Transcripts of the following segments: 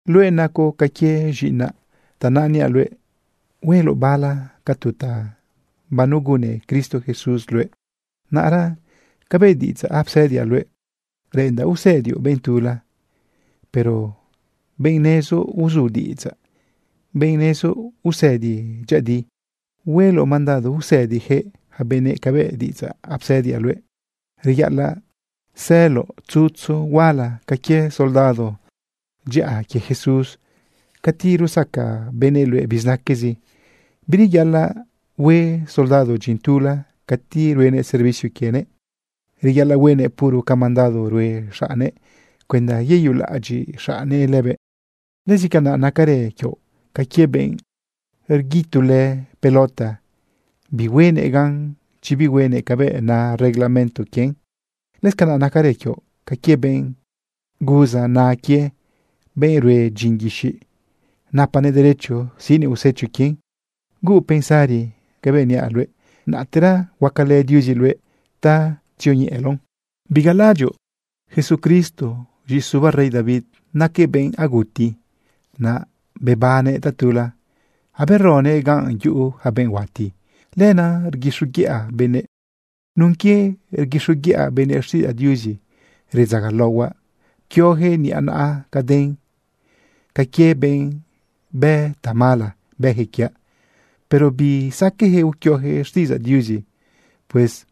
Luëꞌ nacoꞌ ca quie z̃iꞌinaꞌ. Tanaꞌ niaꞌ luëꞌ hueloꞌ bala ca tu ta banegunne Cristo Jesús luëꞌ. Naꞌra cabëꞌ diꞌidzaꞌ apsëdiaꞌ luëꞌ, reꞌendaꞌ usëdioꞌ benꞌ tula, pero benꞌ nezoꞌ uzu diꞌidzaꞌ, benꞌ nezoꞌ usëdi dyëꞌëdi. Hueloꞌ mandado usëdijëꞌ yaca benëꞌ cabëꞌ diꞌidzaꞌ apsëdiaꞌ luëꞌ. Reyaꞌalaꞌ sëloꞌ tzutzu huala ca quie soldado dyaꞌa quie Jesús cati rusaca benëꞌ luëꞌ bizinaquezi. Bireyaꞌalaꞌ hue soldado dyin tula cati ruenëꞌ servicio quienëꞌ. Reyaꞌalaꞌ huenëꞌ puro ca mandado rue xaꞌne cuenda yeyulaꞌadyiꞌ xaꞌne lëbëꞌ. Lëscanaꞌ nacarë quioꞌ ca quie benꞌ rguitulë pelota, bihuenëꞌ gan chi bihuenëꞌ cabëꞌ na reglamento quien. Lëscanaꞌ nacarë quioꞌ ca quie benꞌ guza na quie, benꞌ rue dyin guixiꞌ, napanëꞌ derecho siꞌnëꞌ usecho quien. Huuꞌ pensari cabëꞌ niaꞌ luëꞌ, naꞌtera huacalë Diuzi luëꞌ ta tzioñeꞌeloꞌn. Bigalalaꞌadyoꞌ Jesucristo, z̃iꞌisubaꞌ rey David. Naquëꞌ benꞌ aguti, naꞌ bebannëꞌ tatula aberoguëꞌ ganꞌ yuꞌu ja benꞌ huati. Lenaꞌ rguixoguiꞌa benëꞌ. Nun quie rguixoguiꞌa benëꞌ xtiꞌidzaꞌ Diuzi, redzagalaohuaꞌ pquioyaquëꞌ niꞌa naꞌa caden. Ca quie benꞌ bë tamala, bëyaquëꞌ quiaꞌ. Pero bisaqueꞌyaquëꞌ uquioyaquëꞌ xtiꞌidzaꞌ Diuzi. Pues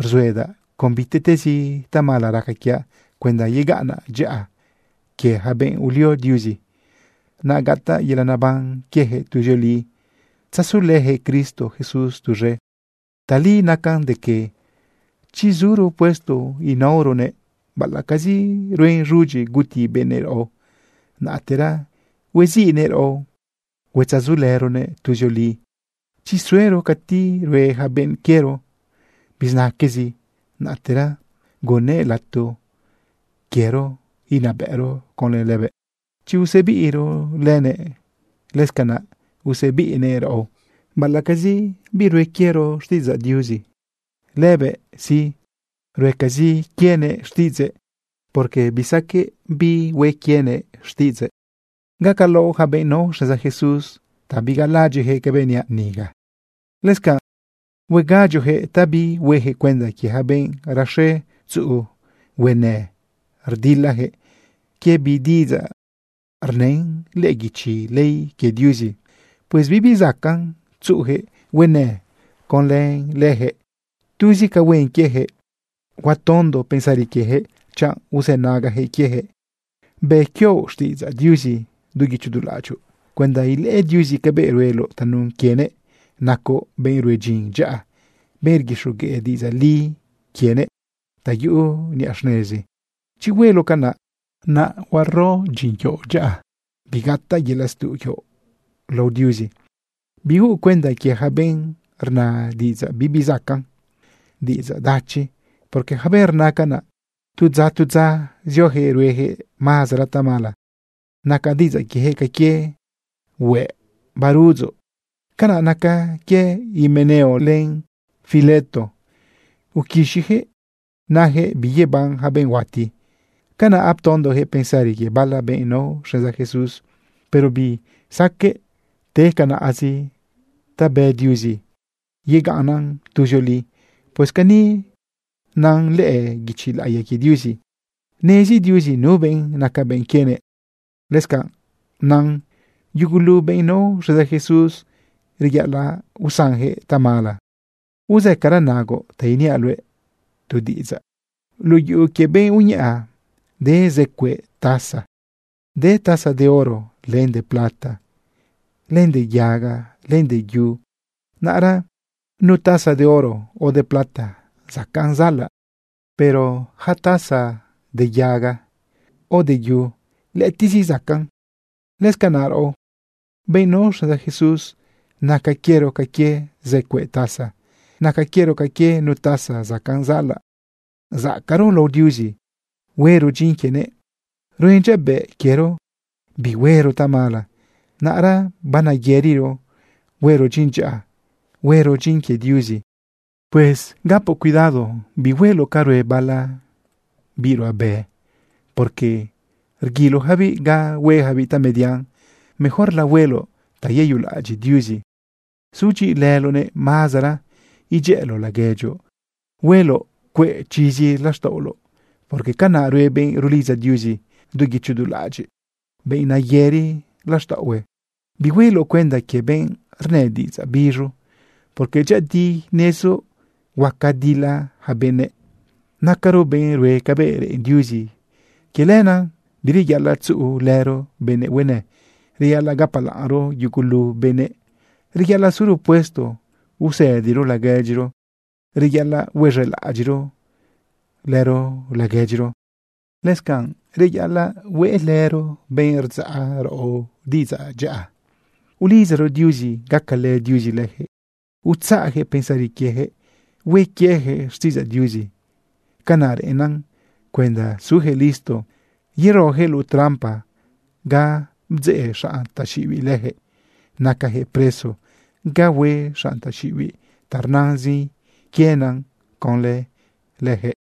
rzuedaꞌ con bitiꞌtezi tamala raca quiaꞌ cuenda yegaꞌnnan dyaꞌa quie yaca benꞌ ulio Diuzi, naꞌ gataꞌ yelaꞌ neban quieyaquëꞌ tuzioli tzasulëyaquëꞌ Cristo Jesús tuz̃e. Tali nacan de que: Chi zuro puesto inaoronëꞌ baꞌalaꞌcazi ruen z̃udyi guti benëꞌ raꞌo, naꞌtera hueziꞌnëꞌ raꞌo huetzasulëronëꞌ tuzioli. Chi suero cati rue ja benꞌ quiero bizinaquezi, naꞌtera gunnëꞌ lato quiero inabëꞌro conlë lëbëꞌ. Chi usebiꞌro lëbëꞌ, lëscanaꞌ usebiꞌnëꞌ raꞌo. Baꞌalaꞌcazi birue quiero xtiꞌidzaꞌ Diuzi, lëbëꞌ sí, ruecazi quienëꞌ xtiꞌidzëꞌ, porque bisaqueꞌ birue quienëꞌ xtiꞌidzëꞌ. Gacalaoꞌ yaca benꞌ nao xneza Jesús ta bigalalaꞌadyiꞌyaquëꞌ cabëꞌ niaꞌ niga. Lëscanꞌ huegadyoꞌyaquëꞌ ta bihuejëꞌ cuenda quie yaca benꞌ raxe tzuꞌu huenë rdilayaquëꞌ quie bi diꞌidzaꞌ rnën lëꞌë guichi ley quie Diuzi. Pues bibi zacaꞌn tzuꞌuyaquëꞌ huenëꞌ conlë leyaquëꞌ. Tuzi ca huen quieyaquëꞌ, huatondo pensari quiejëꞌ chanꞌ uzënagajëꞌ quiejëꞌ. Bë quioꞌ xtiꞌidzaꞌ Diuzi du guicho du laꞌadyoꞌ cuenda ilëꞌë Diuzi cabëꞌ rueloꞌ tanun quienëꞌ nacoꞌ benꞌ rue dyin dyaꞌa, benꞌ rguixogueꞌ diꞌidzaꞌ li quienëꞌ ta yuꞌu niꞌa xnezi. Chi hueloꞌ canaꞌ, naꞌ huaro dyin quioꞌ dyaꞌa, bigataꞌ yelaꞌ stuꞌ quioꞌ lao Diuzi. Bihuuꞌ cuenda quie yaca benꞌ rna diꞌidzaꞌ bibi zacaꞌn, diꞌidzaꞌ dachizi, porque yaca benꞌ rna canaꞌ, tu dza, tu dza, ziojëꞌ ruejëꞌ mazara tamala. Naca diꞌidzaꞌ quiejëꞌ ca quie hueꞌ baruꞌudzoꞌ. Canaꞌ naca quie Himeneo len Fileto. Uquixiyaquëꞌ nayaquëꞌ biyeban yaca benꞌ huati. Canaꞌ aptondojëꞌ pensari quie bala benꞌ nao xneza Jesús. Pero bisaqueꞌ te canaꞌzi ta bë Diuzi, yegaꞌnnan tuzioli. Pues cani nan lëꞌë guichi laꞌiya quie Diuzi: “Nezi Diuzi nu benꞌ naca benꞌ quienëꞌ.” Lëscanꞌ nan: “Yugulu benꞌ nao xneza Jesús, reyaꞌalaꞌ usanjëꞌ tamala.” Uzëcara nagoꞌ ta iniaꞌ luëꞌ tu diꞌidzaꞌ. Luꞌu yuꞌu quie benꞌ uñaꞌa de zë cueꞌ taza. De taza de oro, len de plata, len de yaga, len de yu. Naꞌra nu taza de oro o de plata zacaꞌn zaꞌalaꞌ. Pero yaca taza de yaga o de yu, lëꞌëtiꞌzi zacaꞌn. Lëscanaꞌ raꞌo, benꞌ nao xneza Jesús, naca quiero ca quie zë cueꞌ taza. Naca quiero ca quie nu taza zacaꞌn zaꞌalaꞌ, zacaꞌro lao Diuzi, huero dyin quienëꞌ. Ruen dyabëꞌ quiero bihuero tamala, naꞌra baneyëriro huero dyin dyaꞌa, huero dyin quie Diuzi. Pues gapoꞌ cuidado, bihueloꞌ ca rue bala biꞌ ruꞌabe, porque rguiloyacabiꞌ ga huejabiꞌ tamedian. Mejorla hueloꞌ ta yeyulaꞌadyiꞌ Diuzi, sudyiꞌilëloꞌnëꞌ mazara, idyëꞌëloꞌ laguedyoꞌ, hueloꞌ cueꞌ chizi laxtaꞌoloꞌ, porque canaꞌ rue benꞌ rulidza Diuzi du guicho du laꞌadyiꞌ, benꞌ nayëri laxtaꞌohue. Bihueloꞌ cuenda quie benꞌ rnë diꞌidzaꞌ biz̃u, porque dyëꞌëdi nezoꞌ huaca dila yaca benëꞌ. Nacaro benꞌ rue cabëꞌ reꞌen Diuzi. Quie lenaꞌ bireyaꞌalaꞌ tzuꞌulëro benëꞌ huenë. Reyaꞌalaꞌ gapalaꞌnro yugulu benëꞌ. Reyaꞌalaꞌ suro puesto usëdiro laguedyiro. Reyaꞌalaꞌ huez̃elaꞌadyiꞌro lëro laguedyiro. Lëscanꞌ reyaꞌalaꞌ hueꞌlëro benꞌ rdzaꞌ raꞌo diꞌidzaꞌ dyaꞌa ulidzaro Diuzi gacalë Diuzi lëjëꞌ utzaꞌjëꞌ pensari quiejëꞌ hue quieyaquëꞌ xtiꞌidzaꞌ Diuzi. Canaꞌ reꞌennan cuenda sujëꞌ listo yerojëꞌ luꞌu trampa ga bdzeꞌ xanꞌ taxiꞌibiꞌ lëjëꞌ nacajëꞌ preso ga hue xanꞌ taxiꞌibiꞌ ta rnazin quiena conlë lëjëꞌ.